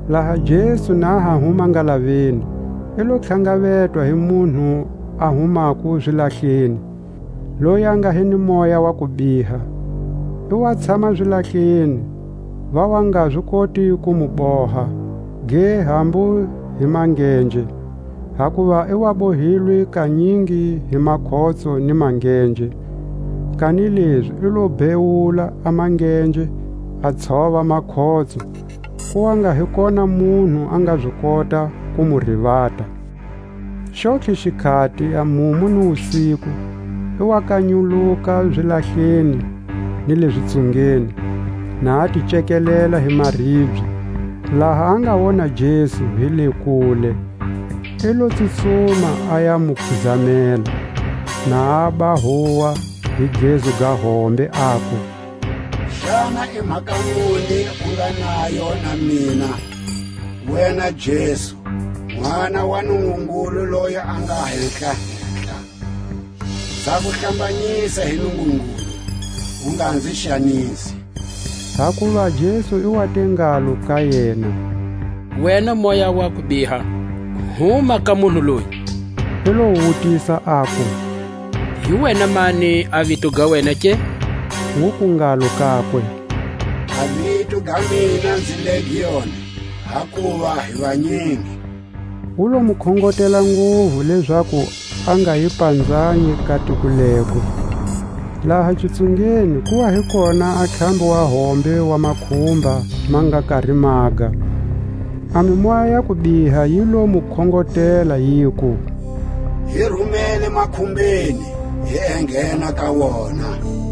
Laha Jesu na ha huma ngalaveni, i lo tlhangavetwa hi munhu a humako zilahleni, loyi a nga hi ni moya wa kubiha. I wa tshama zilahleni; va wa nga zi koti ku mu boha, ge, hambu hi mangenje; hakuva i wa bohilwe kanyingi hi makhotso ni mangenje, kanilezi i lo bhewula a mangenje a tshova makhotso; ku wa nga hi kona munhu a nga zi kota ku mu rivata. Xontlhe xikhati, a mumu ni wusiku, i wa kanyuluka zilahleni ni le zitsungeni, na a ti cekelela hi maribye. Laha a nga wona Jesu hi le kule, i lo tsutsuma a ya mu khizamela, na aba huwa hi gezu ga hombe, aku: Xana i mhaka muni u nga nayo na mina, wena Jesu, Nʼwana wa Nungungulu loyi a nga Hehla-hehla? Nza ku hlambanyisa hi Nungungulu, u nga nzi xanisi. Hakuva Jesu i wa te ngalo ka yena: Wena moya wa kubiha, huma ka munhu loyi! I lo wu wutisa aku: Hi wena mani a vito ga wena ke? Wuku ngalo kakwe: A vito ga mina nzi Legioni, hakuva hi vanyingi. Wu lo mu khongotela nguvu lezaku a nga yi panzanyi ka tiko lego. Laha xitsungeni ku wa hi kona a ntlhambi wa hombe wa makhumba ma nga kari maga, a mimoya ya kubiha yi lo mu khongotela, yiku: Hi rumele makhumbeni, hi enghena ka wona.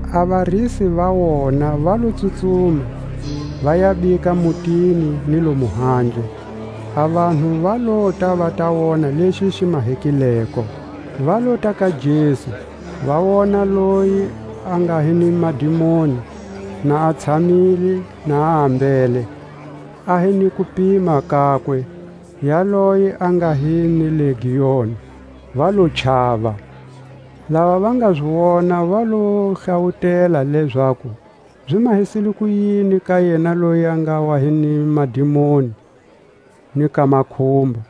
A varisi va wona va lo tsutsuma, va ya bika mutini ni lomu handle; a vanhu va lota va ta wona lexi xi mahekileko. Va lota ka Jesu, va wona loyi a nga hi ni madimoni, na a tshamile na a ambele, a hi ni kupima kakwe, yaloye a nga hi ni legioni; va lo chava. Lava va nga zi wona va lo va hlawutela, lezaku zi mahisile kuyini ka yena loyi a nga wa hi ni madimoni, ni ka makhumba.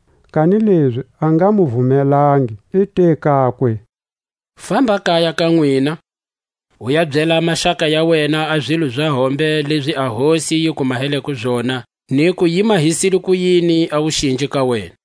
Kanilezi a nga mu vumelangi, i te kakwe: Famba kaya ka nwina, u ya byela a maxaka ya wena a zilo za hombe lezi a Hosi yi ku maheleko zona, niku yi mahisile kuyini a wuxinji ka wena.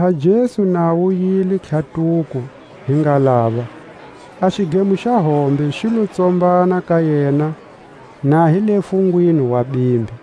Laha Jesu na a wuyile tlhatuko hi ngalava, a xidlemo xa hombe xi lo tsombana ka yena na hi le fungwini wa bimbi.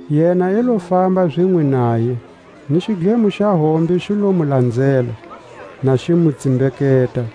Yena i lo famba zinwe naye, ni xidlemo xa hombe xi lo mu lanzela, na xi mu tsimbeketa.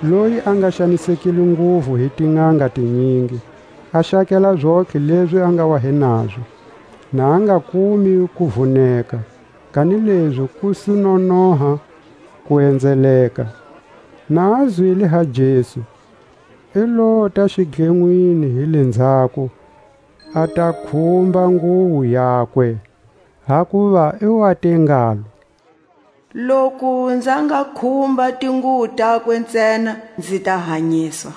loyi a nga xanisekile nguvu hi tinʼanga tinyingi, a xakela zontlhe lezi a nga wa hi nazo, na a nga kumi kuvuneka, kanilezi ku su nonoha ku enzeleka; na a zwile ha Jesu, i lota xidlenwini hi lenzhako, a ta khumba nguwo yakwe; hakuva i wa te ngalo: Loku nza nga khumba tinguwo takwe ntsena, nzi ta hanyiswa.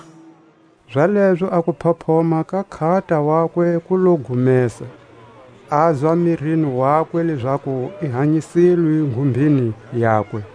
Zalezo a kuphophoma ka nkhata wakwe ku lo gumesa; azwa mirini wakwe lezaku i hanyisilwe nghumbeni yakwe.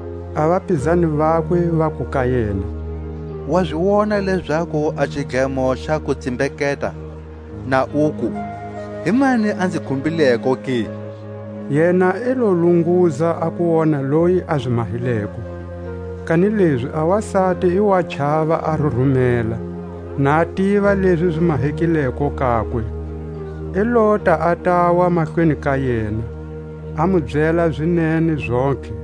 A vapizani vakwe Vaku ka yena: Wa zi Wona lezaku a xidlemo xa ku tsimbeketa, na uku: Himani a nzi khumbileko ke? Yena i lo lunguza a ku wona loyi a zi mahileko. Kanilezi a wasati i wa chava a rurumela, na tiva lezi zi mahekileko kakwe, i lota a tawa mahlweni ka yena, a mu byela zinene zontlhe.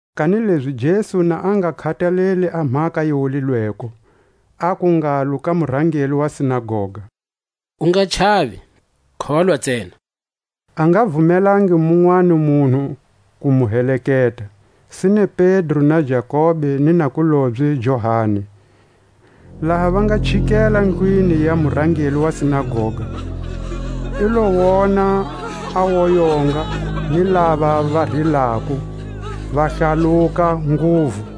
Kanilezi Jesu na a nga khataleli a mhaka yi wulilweko, aku ngalo ka murangeli wa sinagoga: U nga chavi, kholwa ntsena. A nga vumelangi munwani munhu ku mu heleketa, sine Pedro, na Jakobe ni nakulobye Johani. Laha va nga chikela ndlwini ya murangeli wa sinagoga, i lo wona a woyonga, ni lava va rilako, va hlaluka nguvu.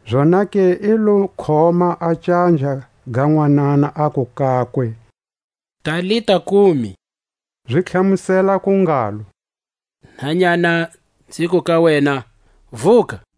Zonake i lo khoma a canja ga nwanana, aku kakwe: Talita Kumi; zi tlhamuseleko ku ngalo, Nhanyana, nziku ka wena, Vuka!